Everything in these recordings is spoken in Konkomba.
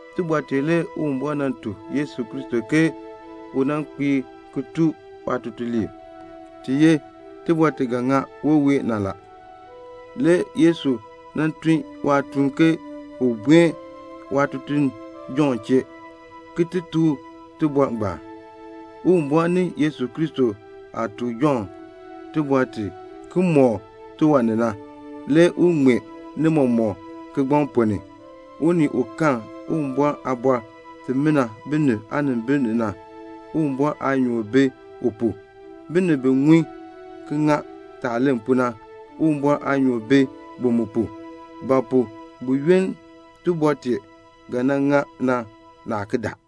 Tibɔr tee le Uwumbɔr nan tuk Yesu Kristo ke u nan kpiir ki tuk waatutuliib. Ti ye tibɔr ti ga ŋa wɔween na. Le Yesu nan tun waatuun ke un buen waatutuln Jɔnn chee ki ti tuk u tibɔr tee. Uwumbɔr ni Yesu Kristo aah tuk Jɔnn tibɔr ti na, ki mɔk u tiwan ni na, le u ŋmee ni mɔmɔk kigbaŋ ponn ni. Unii u karn Uwumbɔr aaliin imina binib aanimbil ni na, Uwumbɔr aanyoor bi u pu. Binib bi ŋun ki ŋa yaah len pu na, Uwumbɔr aanyoor bi, bi mu pu. Ba pu? buyoonn tibɔr tee ga ŋa na, naa ki daa.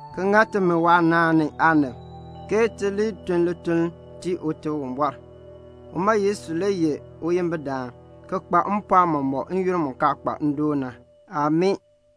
ki ŋa timi waanaan ni aanib, ti li tun lituln ki tii Ute Uwumbɔr. Uma Yesu le ye uyimbidaan, ki kpa mpɔɔn mɔmɔk n-yoonn mu kaa kpa ndoon na. Amii.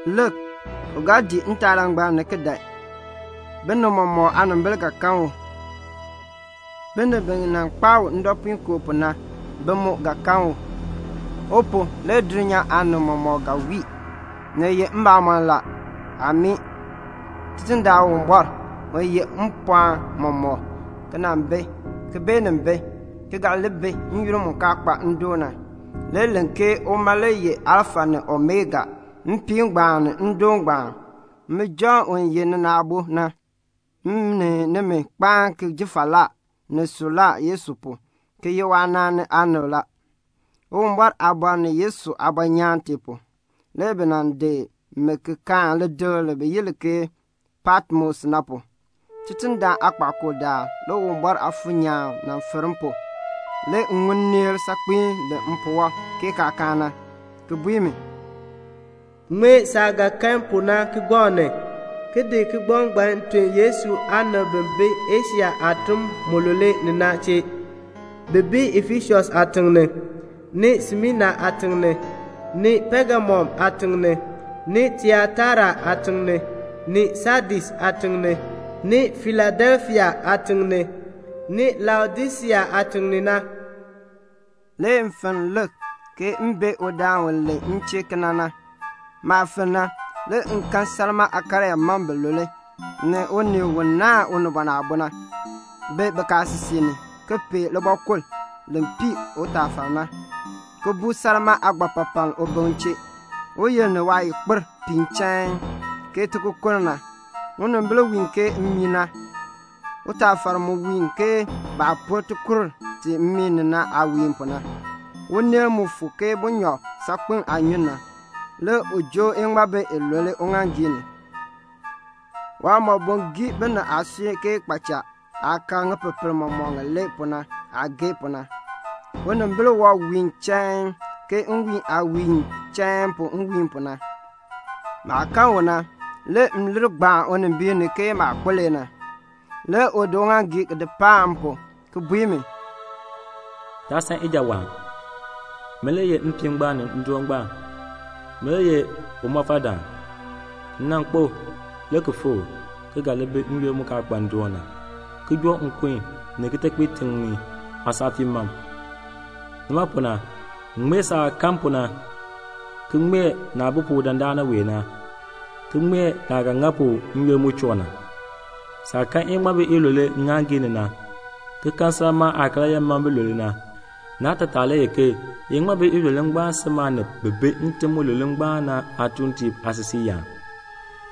Lik, u ga dii ntaalangbam ni ki dan. Binib mɔmɔk aanimbil ga kan u. Binib bi nan kpaa u ndɔpuinkoo pu na, bi mu ga kan u. U pu, le dulnyaa aanib mɔmɔk ga wii. Ni ye mbamɔn. Amii. Tidindaan Uwumbɔr, u yeh mpɔɔn mɔmɔk, ki nan bi, ki beenin bi, ki ga li bi n-yoonn mu kaa kpa ndoon na, le len ke uma le ye Alfa ni Omega, mpiin ngbaan ni ndoon ngbaan. Min Jɔnn u ye nina aabo na, m ni nimi kpaan ki ji falaa ni suklaa Yesu pu, ki ye waanaan ni aanib la. Uwumbɔr aaliin ni Yesu aabɔnyaan tee pu, le bi nan di mi ki kaan lidikl li bi yi li ke Patmos na pu. Tidindaan aakpakool daal le Uwumbɔr Aafuur nyaan fir m pu. Le m ŋun nneel saakpiin len mpuwɔb ke kaakaan na, ki bui mi, "Ŋmee saah ga kan pu na kigbaŋ ni, ki di tun kigbaŋ ngbaan Yesu aanib bi bi Asia aatim mulule ni na chee, bi bi Efesus aatiŋ ni, ni Smina aatiŋ ni, ni Pegamum aatiŋ ni, ni Tiataira aatiŋ ni, ni Sadis aatiŋ ni, ni Filadelfia aatiŋ ni, ni Laodisea aatiŋ ni na." Le m fenn m bee udaan u len m chee kena na. Maah fenn na, le m kan salmaa aakaryaa mam bilule, ni unii u naahn Unibɔn Aabo na, bi bikaasisik ni, ki pee libɔkul li pii utaafar na, ki buu salmaa aagbapapaln ubiŋ chee. Uyil ni waayikpir piin chain, ke tikokonn na. Unimbil wiin ke mmii na. Utaafar mu wiin ke baah pur tikur mmii ni na aah wiin pu na. Uneel mu fuk ke bunyɔb saakpem aanyun na. Le u joo iŋmabi ilule uŋaaŋgii ni. Waaliin geei binib aasui ke kpaacha aah kaar ŋipepel mɔmɔk ŋilee pu na aah geei pu na. Unimbil wɔb wiin chain, ke nwiin aah wiin chain pu nwiin pu na. Maah kan u na, le m lir gbaan unimbiin ni ke maah kpo le na. Le u di uŋaaŋgii di paan m pu, ki bui mi, "Taa san ijawaan. Min le ye mpiin ngbaan ni ndoon ngbaan. Min le ye umɔfaldaan. M nan kpo, le ki fikr, ki ga li bi n-yoonn mu kaa kpa ndoon na, ki joo nkun ni kitekpiitiŋ aasaafii mam. Nima pu na, ŋmee saah kan pu na, ki ŋmee naah bi pu dandana wee na, ki ŋmee naah ga ŋa pu n-yoonn mu choo na. Saah kan iŋmabi ilule ŋŋaaŋgii ni na, ki kan salmaa aakaryaa mam bilule na, naatataa le ye ke iŋmabi ilule ngbaan si maanib bi bi ntim mulule ngbaan na aatuuntiib aasisiiyaan.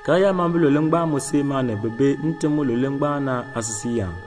Karyaa mam bilule ngbaan mu si maanib bi bi ntim mulule ngbaan na aasisiiyaan.